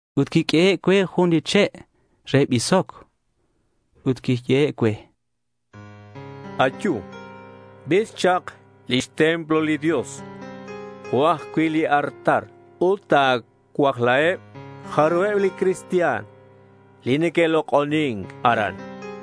Ut quiq'uehe' cue jun li che' re bisoc ut quiyehe' cue: —Ayu, bis chak lix templo li Dios jo' ajcui' li artal ut ta̱cuajlaheb jarubeb li cristian li neque'lok'onin aran.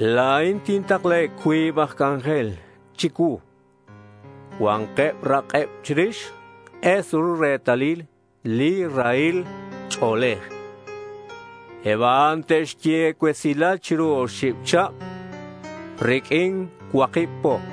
La̱in tintaklaheb cuib aj c'anjel chicuu. Cua̱nk rak'eb chirix k'es ru retalil li rahil ch'o̱lej. Eb a'an te'xye cuesilal chiru oxib chihab riq'uin cuakib po.—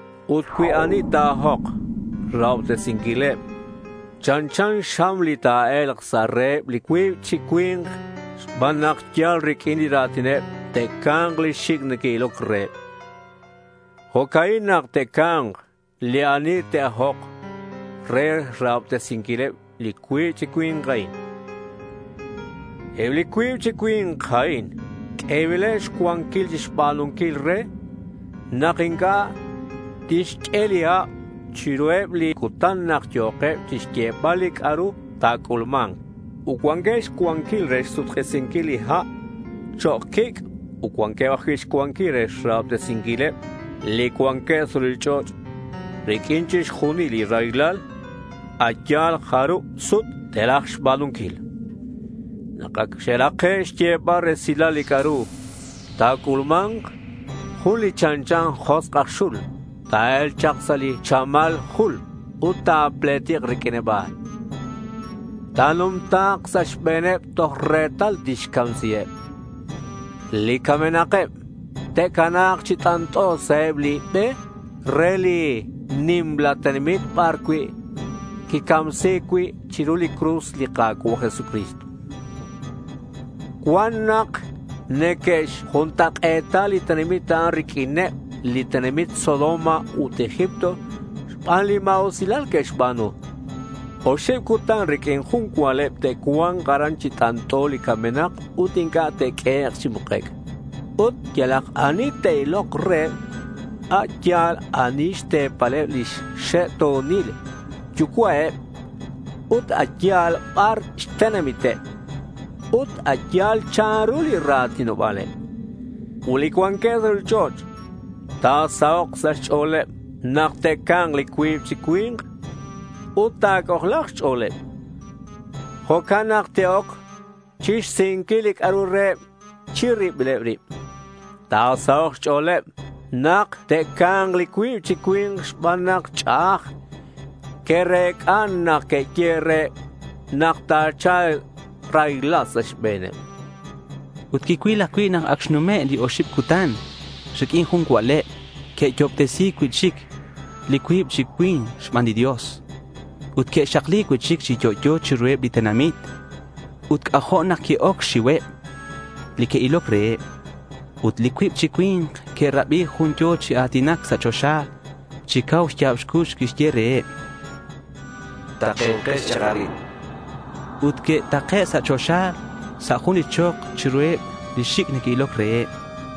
Ut cui ani ta̱ajok xrahobtesinquileb, chanchan xam li ta̱e̱lk sa' reheb li cuib chi cui̱nk xban nak yal riq'uin li ra̱tineb te'ca̱mk li xic' neque'iloc reheb. Jo'ca'in nak te'ca̱mk li ani te'ajok re xrahobtesinquileb li cuib chi cui̱nk a'in. Eb li cuib chi cui̱nk a'in q'uebileb xcuanquil chixba̱nunquil re nak inc'a' tixq'ue li hab chiruheb li cutan nak yo̱keb chixyebal li c'a'ru ta̱c'ulma̱nk. Ut cuanqueb xcuanquil re xsuk'isinquil li ha' chok' quic' ut cuanqueb ajcui' xcuanquil re xrahobtesinquileb li cuanqueb sa' ruchich'och' riq'uin chixjunil li raylal a' yal jarub sut te'raj xba̱nunquil. Nak acak xe'rake' xyebal resilal li c'a'ru ta̱c'ulma̱nk, jun li chanchan josk' aj xul ta̱e̱lk chak sa' li chamal jul ut ta̱pletik riq'uineb a'an. Ta̱numta̱k sa' xbe̱neb toj retal tixcamsiheb. Li camenak te'cana̱k chi t'ant'o sa' eb li be re li nimla tenamit bar quicamsi̱c cui' chiru cruz li Ka̱cua' Jesucristo. Cuan nak neque'xjuntak'e̱ta li tenamit a'an riq'uineb li tenamit Sodoma ut Egipto xban li ma̱usilal que'xba̱nu. Oxib cutan riq'uin jun cua'leb te'cua̱nk aran chi t'ant'o li camenak ut inc'a' te'q'uehek' chi mukec'. Ut yalak ani te'ilok reheb, a' yal ani xte̱paleb lix xe'to̱nil yucua'eb, ut a' yal bar xtenamiteb, ut a' yal chanru li ra̱tinoba̱leb. Ut li cuanqueb sa' ruchich'och' ta̱sahok' sa' xch'o̱leb nak te'ca̱mk li cuib chi cui̱nk ut ta̱c'ojla̱k xch'o̱leb. Jo'can nak te'oc chixsihinquil c'a'ru reheb chi ribileb rib. Ta̱sahok' xch'o̱leb nak te'ca̱mk li cuib chi cui̱nk xban nak ch'a'aj que'rec'a nak que'yehe' reheb nak ta̱cha̱lk raylal sa' xbe̱neb. Ut quicuil ajcui' nak ac xnume' li oxib cutan riq'uin jun cua'leb, que'yo'obtesi̱c cui'chic li cuib chi cui̱nk xban li Dios ut que'xakli cui'chic chi yo'yo chiruheb li tenamit. Ut c'ajo' nak qui-oc xxiuheb li que'iloc reheb. Ut li cuib chi cui̱nk que'rabi jun yo̱ chi a̱tinac sa' choxa. Chi cau xya̱b xcux quixye reheb: —Takenkex chak arin, chan. Ut que'take' sa' choxa sa' jun li chok chiruheb li xic' neque'iloc reheb.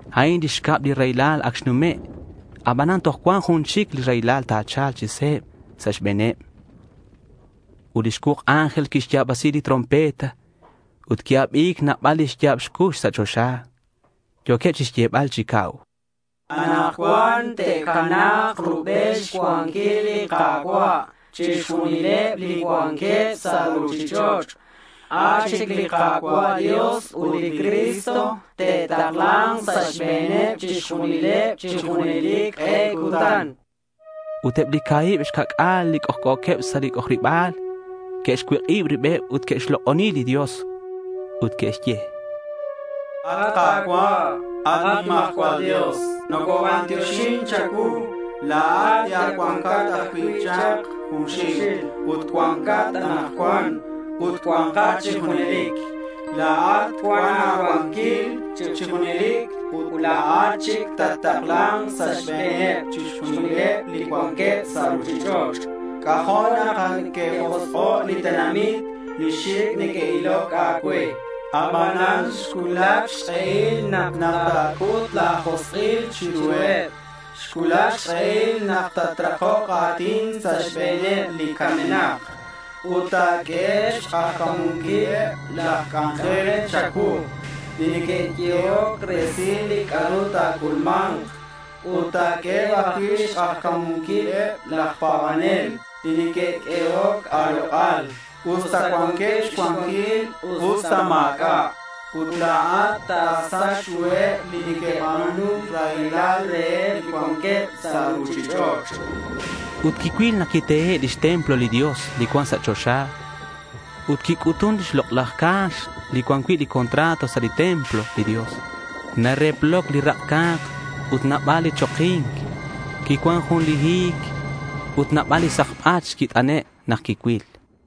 A'in li xcab li raylal ac xnume'. Abanan toj cuan jun chic li raylal ta̱cha̱lk chi se̱b sa' xbe̱neb. Ut li xcuuk ángel quixya̱basi lix trompeta. Ut qui-abi̱c nabal li xya̱b cux sa' choxa. Yo̱queb chixyebal chi cau: —Anakcuan te'cana̱k rubel xcuanquil li Ka̱cua' chixjunileb li cuanqueb sa' ruchich'och'. A' chic li Ka̱cua' Dios ut li Cristo te'takla̱nk sa' xbe̱neb chixjunileb chi junelic k'e cutan, chanqueb. Ut eb li ca̱hib xca'c'a̱l li c'ojc'o̱queb sa' lix c'ojariba̱l que'xcuik'ib ribeb ut que'xlok'oni li Dios. Ut que'xye: —At Ka̱cua', at nimajcual Dios, nocobantioxin cha̱cuu. La̱at li ac cuancat ajcui' chak junxil ut cuancat anakcuan ut cua̱nkat chi junelic. La̱at cuan a̱cuanquil chi junelic ut la̱at chic tattakla̱nk sa' xbe̱neb chixjunileb li cuanqueb sa' ruchich'och'. C'ajo' nak que'josk'o' li tenamit li xic' neque'iloc a̱cue. Abanan xcuulac xk'ehil nak ta̱c'ut la̱ josk'il chiruheb. Xcuulac xk'ehil nak tatrakok a̱tin sa' xbe̱neb li camenak. Ut ta̱q'ueheb xk'ajca̱munquileb laj c'anjel cha̱cuu li que'yehoc resil li c'a'ru ta̱c'ulma̱nk. Ut ta̱q'ueheb ajcui' xk'ajca̱munquileb laj pa̱banel li que'q'uehoc a̱lok'al, usta cuanqueb xcuanquil usta ma̱c'a'. Ut la̱at ta̱sach ruheb li que'ba̱nun raylal reheb li cuanqueb sa' ruchich'och', chanqueb. Ut quicuil nak quitehe' lix templo li Dios cuan sa' choxa. Ut quic'utun li Lok'laj Ca̱x li cuan cui' li contrato sa' lix templo li Dios. Nareploc li rak' ca̱k ut nabal li choki̱nc. Quicuan jun li hi̱c ut nabal li sakbach quit'ane' nak quicuil.